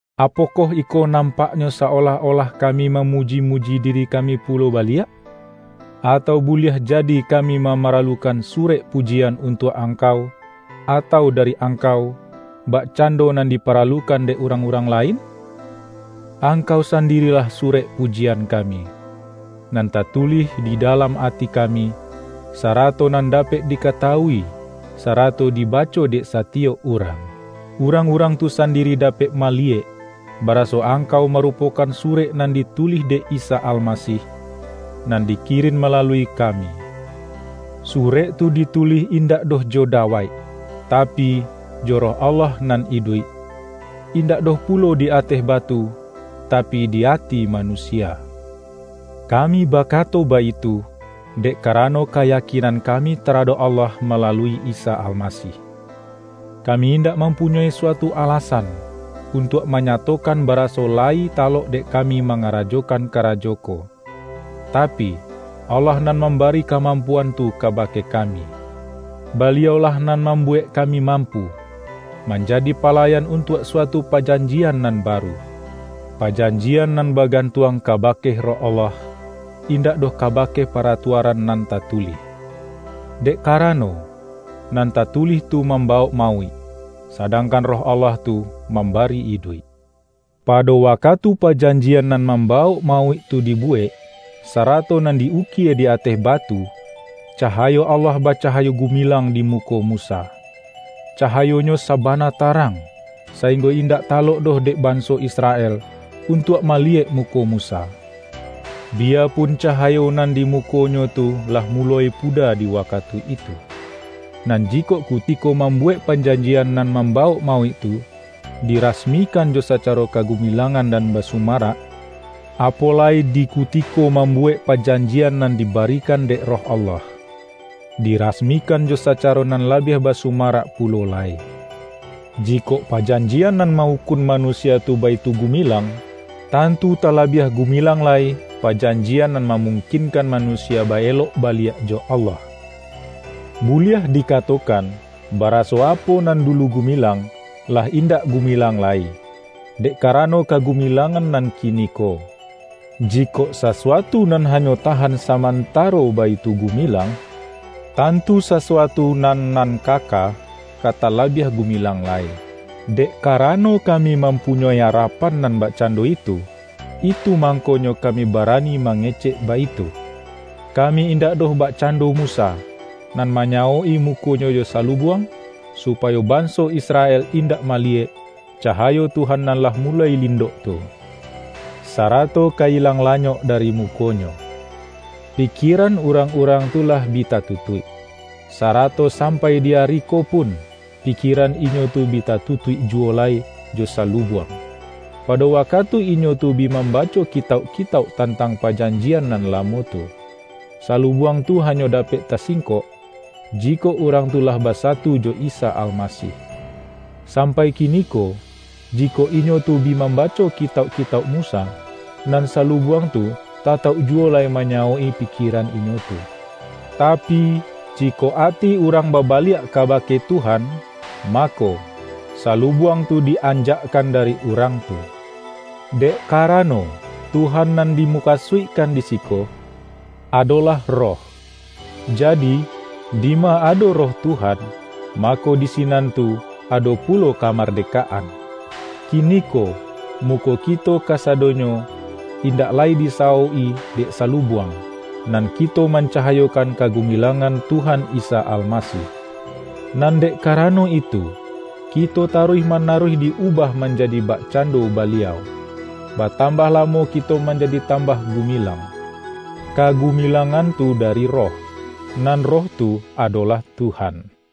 Apokoh iko nampaknyo sa-olah-olah kami mamuji-muji diri ka-mi pulo baliak? Atau buliah jadi ka-mi mamaralukan surek pujian untuak angkau, atau dari angkau, bakcando nan diparalukan dek urang-urang la-in? Angkau sandirilah surek pujian kami, nan tatulih di dalam ati kami, sarato nan dapek dikatawui sarato di-baco dek satiyok urang. Urang-urang tu sandiri dapek maliyek, baraso ang-kau marupokan surek nan ditulih dek Isa Almasih, nan dikirin malalui ka-mi. Surek tu ditulih indak doh jo dawaik, tapi, jo Roh Allah nan iduik; indak doh pulo di ateh batu, tapi di ati manusia. Kami bakato baitu, dek karano ka-yakinan kami taradok Allah malalui lsa Almasih. Kami indak mampu-nyoi suatu alasan, untuak manyato-kan baraso layi talok dek kami ma-ngarajokan karajo ko, tapi, Allah nan mambari kamampuan tu kabake ka-mi. Baliau-lah nan mambuwek kami mampu, manjadi palayan untuak sua-tu pajanjian nan baru; pajanjian nan bagantuang kabake Roh Allah, indak doh kabake paratuaran nan tatulih. Dek karano, nan tatulih tu mamba-wok mauik, sadangkan Roh Allah tu mambari iduik. pado wakatu pajanjian nan mam-bawok mauik tu dibuwek, sarato nan di-ukie di ateh batu, cahayo Allah bacahayo gumilang di muko Musa. Cahayonyo sabana tarang, sainggo indak talok doh dek banso Israel, un-tuak maliyek muko Musa, biyapun ca-hayo nan di mukonyo tu lah muloi puda di wakatu itu. Nan jikok kuti-ko mambuwek pajanjian nan mamba-wok mauik tu, dirasmikan jo sacaro kagumilangan nan basumarak, apo lai di kutiko mambuwek pajanjian nan dibarikan dek Roh Allah, dirasmikan jo sacaro nan labiah basumarak pu-lo lai. Jikok pajanjian nan ma-ukun manusia tu baitu gumilang, tantu ta-labiah gumilang lai, pajanjian nan ma-mungkinkan manusia ba-elok baliak jo Allah. Buliah dikatokan, baraso apo nan dulu gumilang, lah indak gu-milang lai, dek karano kagumilangan nan kiniko. Jikok sasuatu nan ha-nyo tahan samantaro, baitu gumilang, tantu sasuatu nan nan kaka, ka tala-biah gumilang lai. Dek karano kami mampunyoi ara-pan nan bakcando itu, itu mangkonyo kami barani mangecek baitu. Kami indak doh bakcando Musa, nan manyawok-i mukonyo jo salubuang, su-payo banso Israel indak maliyek, ca-hayo Tuhan nan lah muloi lindok tu, sarato ka ilang lanyok dari mukonyo. Pikieran urang-urang tu lah bi ta-tutuik. Sarato sampai di ari ko pun, pikieran inyo tu bi tatutuik juwo lai jo salubuang, pado wakatu inyo tu bi mambaco kitauk-kitauk tantang pa-janjian nan lamo tu. Salubuang tu ha-nyo dapek tasingkok, jikok urang tu lah basatu jo Isa Almasih. Sampai kiniko, jikok inyo tu bi mambaco ki-tauk-kitauk Musa, nan salubuang tu tatauk juwo lai manyawok-i pikieran inyo tu. Tapi, jikok ati urang baba-liak kabake Tuhan, mako, salubuang tu di-anjakkan dari urang tu. Dek karano, Tuhan nan dimukasuikkan di siko, adolah Roh. Jadi, dima ado Roh Tuhan, mako, di sinan tu ado pu-lo kamardekaan. Kiniko, muko ki-to kasadonyo, indak lai disawok-i dek salubuang, nan kito mancahayokan kagumilangan Tuhan Isa Almasih. Nan dek karano itu, kito taruih manaruih di-ubah manjadi bakcando Baliau; ba-tambah lamo kito manjadi tambah gu-milang. Kagumilangan tu dari Roh, nan Roh tu adolah Tuhan.